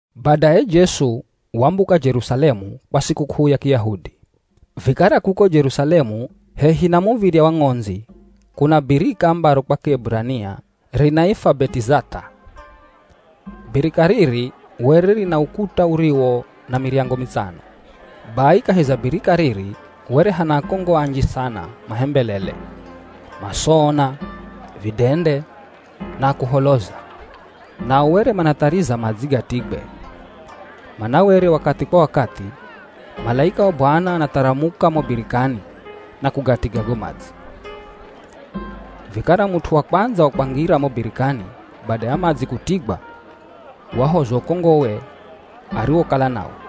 Badaye Jesu wambuka Jerusalemu kwa sikuk'uu ya Kiyahudi. Vikara kuko Jerusalemu hehi na Muv̱irya wa Ng'ondzi kuna birika ambaro kwa Kieburania rinaifwa Betizath'a. Birika riri were rina ukuta uriwo na miryango mitsano. Bai kahi za birika riri were hana akongo anji sana mahembelele, masoona, vidende, na akuholoza. [ Nao were manathariza madzi gatigwe, mana were wakathi kwa wakathi, malaika wa Bwana anatharamuka mo birikani na kugatiga go madzi. Vikara mut'u wa kwandza wa kwangira mo birikani bada ya madzi kutigwa wahozwa ukongowe ariwokala nawo.]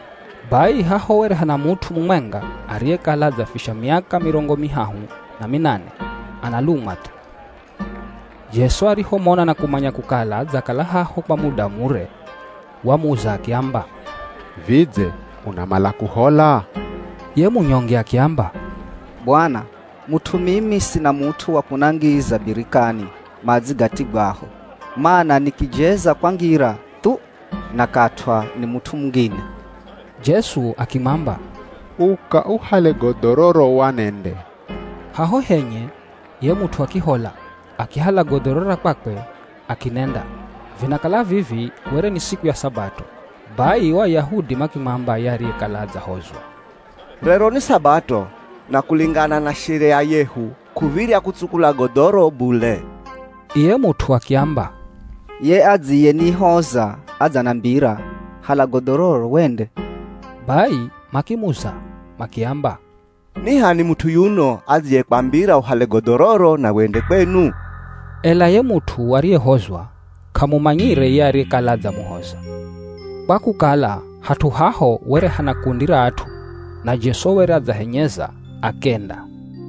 Bai haho were hana mut'u mumwenga ariyekala adzafisha miaka mirongo mihahu na minane analumwa thu. Jesu arihomona na kumanya kukala adzakala haho kwa muda mure, wamuza akiamba, “Vidze unamala kuhola?” Ye munyonge akiamba, “Bwana mut'u mimi, sina mut'u wa kunangiza birikani madzi gatigwaho, mana nikijeza kwangira thu, nakatw'a ni mut'u mungine.” Jesu akimwamba, “Uka, uhale godhororo wanende.” Haho henye ye mut'u akihola. Akihala godhoro ra kwakwe akinenda. Vinakala vivi were ni siku ya Sabato. Bai o Ayahudi makimwamba ye ariyekala adzahozwa, “Rero ni Sabato na kulingana na sheria yehu k'uv̱irya kutsukula godhoro bule.” Iye mut'u akiamba, “Ye adziyenihoza adzanambira, ‘Hala godhororo wende.’” Bai makimuza makiamba, “Ni h'ani mut'u yuno adziyekwambira uhale godhororo na wende kwenu?” Ela ye mut'u ariyehozwa k'amumanyire ye ariyekala adzamuhoza, kwa kukala hat'u haho were hana kundi ra at'u na Jesu were adzahenyeza akenda.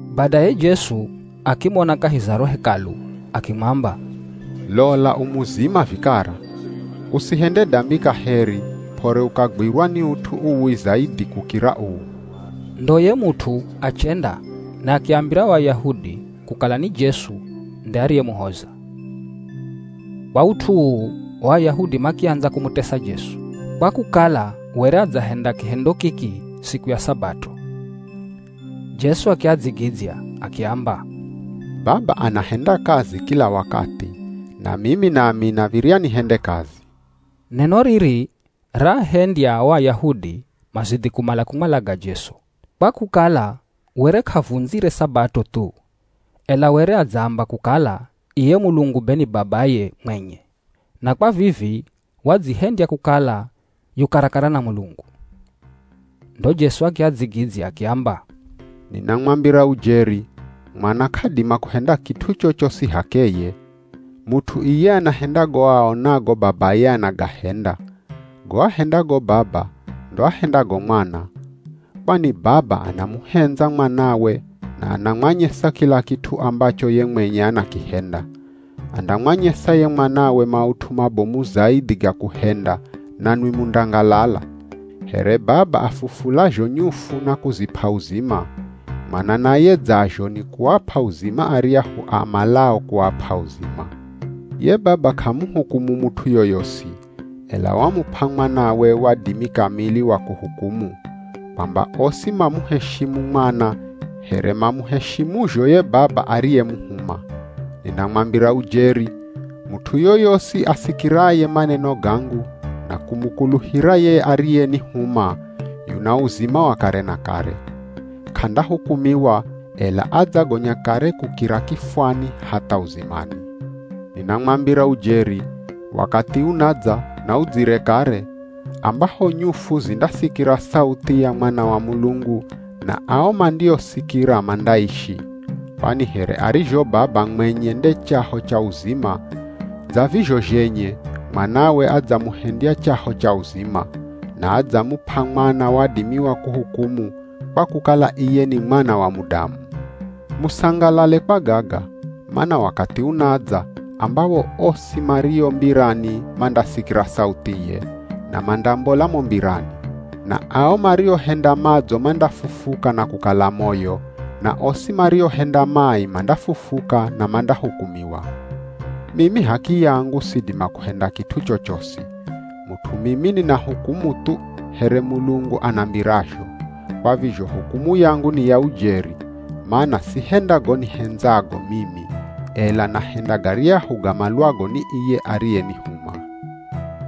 Badaye Jesu akimona kahi za ro Hekalu akimwamba, “Lola u muzima vikara. Usihende dambi kaheri, p'ore ukagwirwa ni ut'u uwi zaidhi kukira uu.” Ndo ye mut'u achenda na akiambira o Ayahudi kukala ni Jesu nde ariyemuhoza. Kwa ut'u uu o Ayahudi makiandza kumutesa Jesu, kwa kukala were adzahenda kihendo kiki siku ya Sabato. Jesu akiadzigidzya, akiamba, “Baba anahenda kazi kila wakathi, na mimi nami nav̱irya nihende kazi.” Neno riri raahendya o Ayahudi mazidhi kumala kumwalaga Jesu, kwa kukala were k'avundzire Sabato thu, ela were adzaamba kukala iye Mulungu be ni babaye mwenye, na kwa vivi wadzihendya kukala yu karakara na Mulungu. Ndo Jesu akiadzigidzya akiamba, “Ninamwambira ujeri, Mwana k'adima kuhenda kit'u chochosi h'akeye. Mut'u iye anahenda go aonago Babaye anagahenda. Go ahendago Baba ndo ahendago Mwana. Kwani Baba anamuhendza Mwanawe na anamwanyesa kila kit'u ambacho ye mwenye anakihenda. Andamwanyesa ye Mwanawe maut'u mabomu zaidhi ga kuhenda, nanwi mundangalala. Here Baba afufulazho nyufu na kuzip'a uzima, Mwana naye dzazho ni kuap'a uzima aryahu amalao kuap'a uzima. Ye Baba k'amuhukumu mut'u yoyosi, ela wamup'a Mwanawe wadimi kamili wa kuhukumu, kwamba osi mamuheshimu Mwana here mamuheshimuzho ye Baba ariyemuhuma. Ninamwambira ujeri, mut'u yoyosi asikiraye maneno gangu na kumukuluhira ye ariyenihuma, yuna uzima wa kare na kare. K'andahukumiwa, ela adzagonya kare kukira kifwani hatha uzimani. Ninamwambira ujeri, wakathi unadza na udzire kare, ambaho nyufu zindasikira sauthi ya Mwana wa Mulungu na ao mandioisikira mandaishi. Kwani here arizho Baba mwenye nde chaho cha uzima, dza vizho zhenye Mwanawe adzamuhendya chaho cha uzima. Na adzamup'a Mwana wadimi wa kuhukumu, kwa kukala iye ni Mwana wa Mudamu. “Musangalale kwa gaga, mana wakathi unadza ambawo osi mario mbirani mandasikira sauthiye, na mandambola mo mbirani. Na ao mariohenda madzo mandafufuka na kukala moyo na osi mariohenda mai mandafufuka na mandahukumiwa.” “Mimi h'akiyangu sidima kuhenda kit'u chochosi. Mut'u mimi ninahukumu thu here Mulungu anambirazho, kwa vizho hukumu yangu ni ya ujeri, mana sihenda go nihendzago mimi, ela nahenda garyahu gamalwago ni iye ariyenihuma.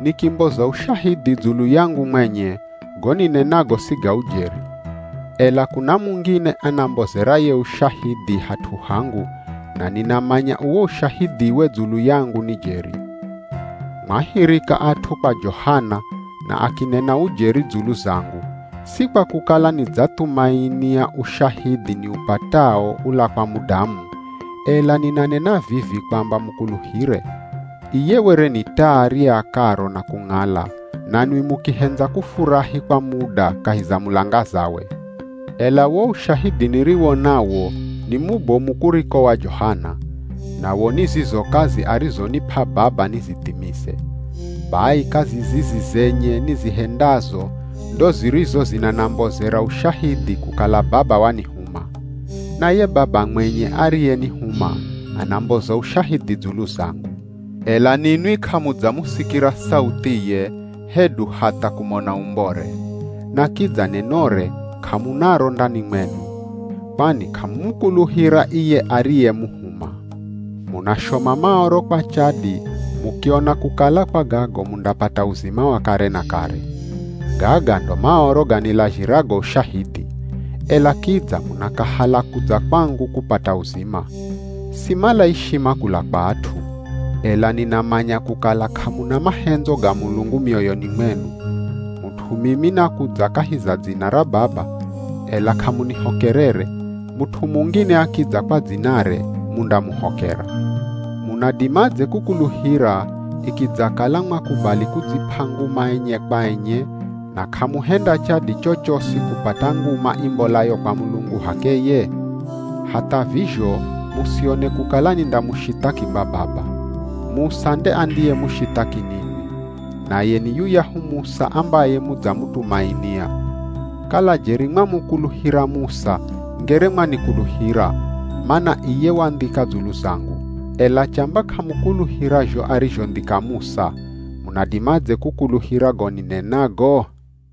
“Nikimboza ushahidhi dzulu yangu mwenye go ninenago si ga ujeri. Ela kuna mungine anambozeraye ushahidhi hat'u hangu na ninamanya uwo ushahidhiwe dzulu yangu ni jeri. “Mwahirika at'u kwa Johana, na akinena ujeri dzulu zangu. Si kwa kukala nidzathumainia ushahidhi niupatao ula kwa mudamu, ela ninanena vivi kwamba mukuluhire. Iye were ni taa riakaro na kung'ala, nanwi mukihendza kufurahi kwa muda kahi za mulangazawe. “Ela wo ushahidhi niriwo nawo ni mubomu kuriko wa Johana, nawo ni zizo kazi arizonip'a Baba nizithimize. Bai kazi zizi zenye nizihendazo ndo zirizo zinanambozera ushahidhi kukala Baba wanihuma. Na ye Baba mwenye ariyenihuma anamboza ushahidhi dzulu zangu. Ela ninwi k'amudzamusikira sauthiye hedu hatha kumona umbore, na kidza nenore k'amunaro ndani mwenu, kwani k'amumukuluhira iye ariyemuhuma. Munashoma Maoro kwa chadi mukiona kukala kwa gago mundapata uzima wa kare na kare. Gaga ndo Maoro ganilazhirago ushahidhi, ela kidza munakahala kudza kwangu kupata uzima. “Simala ishima kula kwa at'u. Ela ninamanya kukala k'amuna mahendzo ga Mulungu mioyoni mwenu. Mut'u mimi nakudza kahi za dzina ra Baba, ela k'amunihokerere, mut'u mungine akidza kwa dzinare mundamuhokera. Munadimadze kukuluhira ikidzakala mwakubali kudzip'a nguma enye kwa enye na k'amuhenda chadi chochosi kupata nguma imbolayo kwa Mulungu h'akeye? Hatha vizho musione kukala nindamushithaki kwa Baba, Musa nde andiyemushithaki ninwi. Naye ni yuyahu Musa ambaye mudzamutumainia. Kala jeri mwamukuluhira Musa ngere mwanikuluhira, mana iye wandhika dzulu zangu. Ela chamba k'amukuluhira zho arizhondhika Musa, munadimadze kukuluhira go ninenago?”